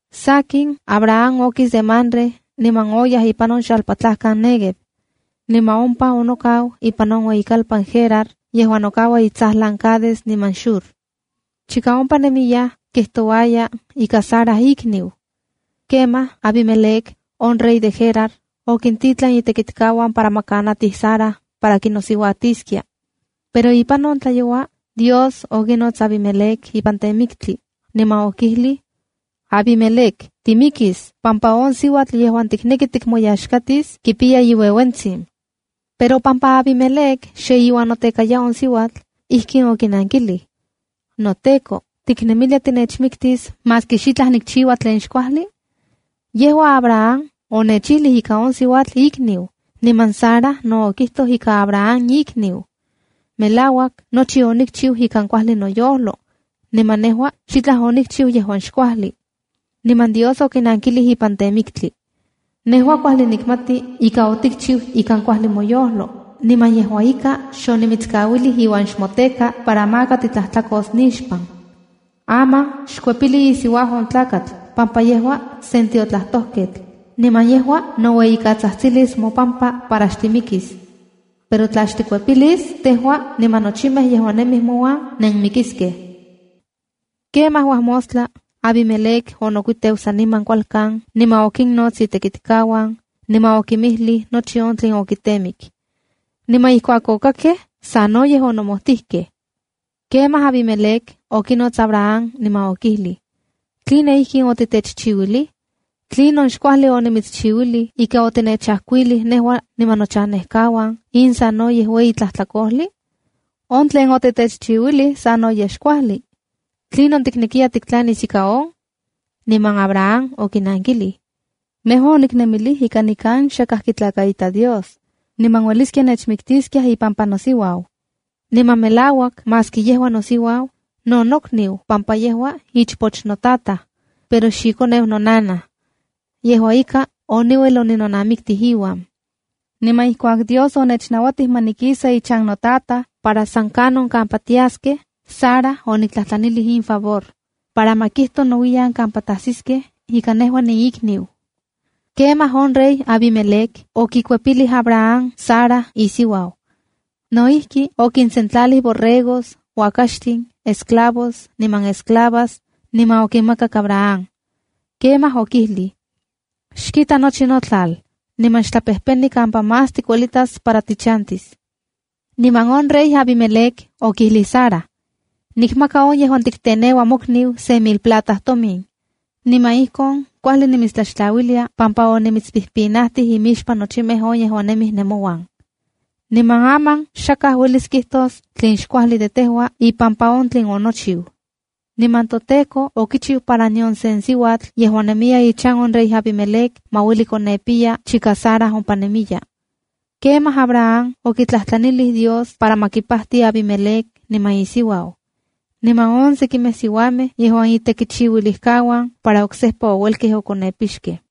Sakin, Abraham okis de Mamre niman oyaj ipan on xalpatlajkan Néguev. Niman ompa onokau ipan on ueyikalpan Gerar yejuan nokaua itsajlan Cades niman Shur. Chika ompa nemiyaj, kijtouaya ika Sara ikniu. Kemaj Abimelec, on rey de Gerar, okintitlan itekitkauan para ma kanatij Sara para kinosiuatiskia. Pero ipan on tlayoua Dios okinots Abimelec ipan temiktli, niman okijlij: “Abimelec, timikis pampa on siuatl yejuan tikneki tikmoyaxkatis kipiya iuejuetsin.” Pero pampa Abimelec xe iuan notekaya on siuatl, ijkin okinankilij: “NoTEKO, ¿tiknemilia tinechmiktis maski xitlaj nikchiua tlen xkuajli? Yejua Abraham onechijlij ika on siuatl ikniu, niman Sara no okijtoj ika Abraham ikniu. Melauak nochi onikchiu ikan kuajli noyojlo, niman nejua xitlaj onikchiu yejuan xkuajli.” Niman Dios okinankilij ipan temiktli: “Nejua kuajli nikmati ika otikchiu ikan kuajli moyojlo, niman yejua ika xonimitskauilij iuan xmoteka para maka titlajtlakos nixpan. Aman xkuepili isiuau on tlakatl pampa yejua sen tiotlajtojketl, niman yejua noueyikatsajtsilis mopampa para xtimikis. Pero tla xtikuepilis, tejua niman nochimej yejuan nemij mouan nenmikiskej.” Kemaj uajmostla, Abimelec onokuiteu saniman kualkan niman okinnots itekitkauan, niman okinmijlij nochi on tlen okitemik. Niman ijkuak okakkej, sanoyej onomojtijkej. Kemaj Abimelec okinots Abraham niman okijlij: —¿Tline inkin otitechchiuilij? ¿Tlinon xkuajli onimitschiuilij ika otitechajkuilij nejua niman nochanejkauan in sanoyej ueyi tlajtlakojli? On tlen otitechchiuilij sanoyej xkuajli. ¿Tlinon tiknekiya tiktlanis ika on? Niman Abraham okinankilij: —Nejua oniknemilij ika nikan xakaj kitlakaita Dios, niman ueliskia nechmiktiskiaj ipampa nosiuau. Niman melauak maski yejua nosiuau, no nokniu pampa yejua ichpoch notataj, pero xikoneu nonanaj. Yejua ika, oniuel oninonamiktij iuan. Niman ijkuak Dios onechnauatij ma nikisa ichan notataj para san kanon kampa tiaskej, Sara oniktlajtlanilij in favor, para ma kijto nouiyan kampa tasiskej ika nejua niikniu. Kemaj on rey Abimelec okikuepilij Abraham Sara isiuau. No ijki, okinsentlalij borregos, uakaxtin, esclavos, niman esclavas, niman okinmakak Abraham. Kemaj okijlij: —Xkita nochi notlal, niman xtlapejpeni kampa más tikuelitas para tichantis. Niman on rey Abimelec okijlij Sara: —Nikmaka, on yejuan tikteneuaya ‘mokniu’, se mil plata tomin. Niman ijkon kuajli nimitstlaxtlauiliya pampa onimitspinajtij imixpan nochimej on yejuan nemij nemouan. Niman aman, xakaj uelis kijtos tlen xkuajli de tejua ipampa on tlen onochiu. Niman toTEKO okichiu para nion sen siuatl yejuan nemiya ichan on rey Abimelec ma ueli konepiya chika Sara ompa nemiya. Kemaj Abraham okitlajtlanilij Dios para ma kipajti Abimelec niman isiuau, niman on sekimej siuamej yejuan itekichiuilijkauan para oksejpa ouelkej okonepixkej.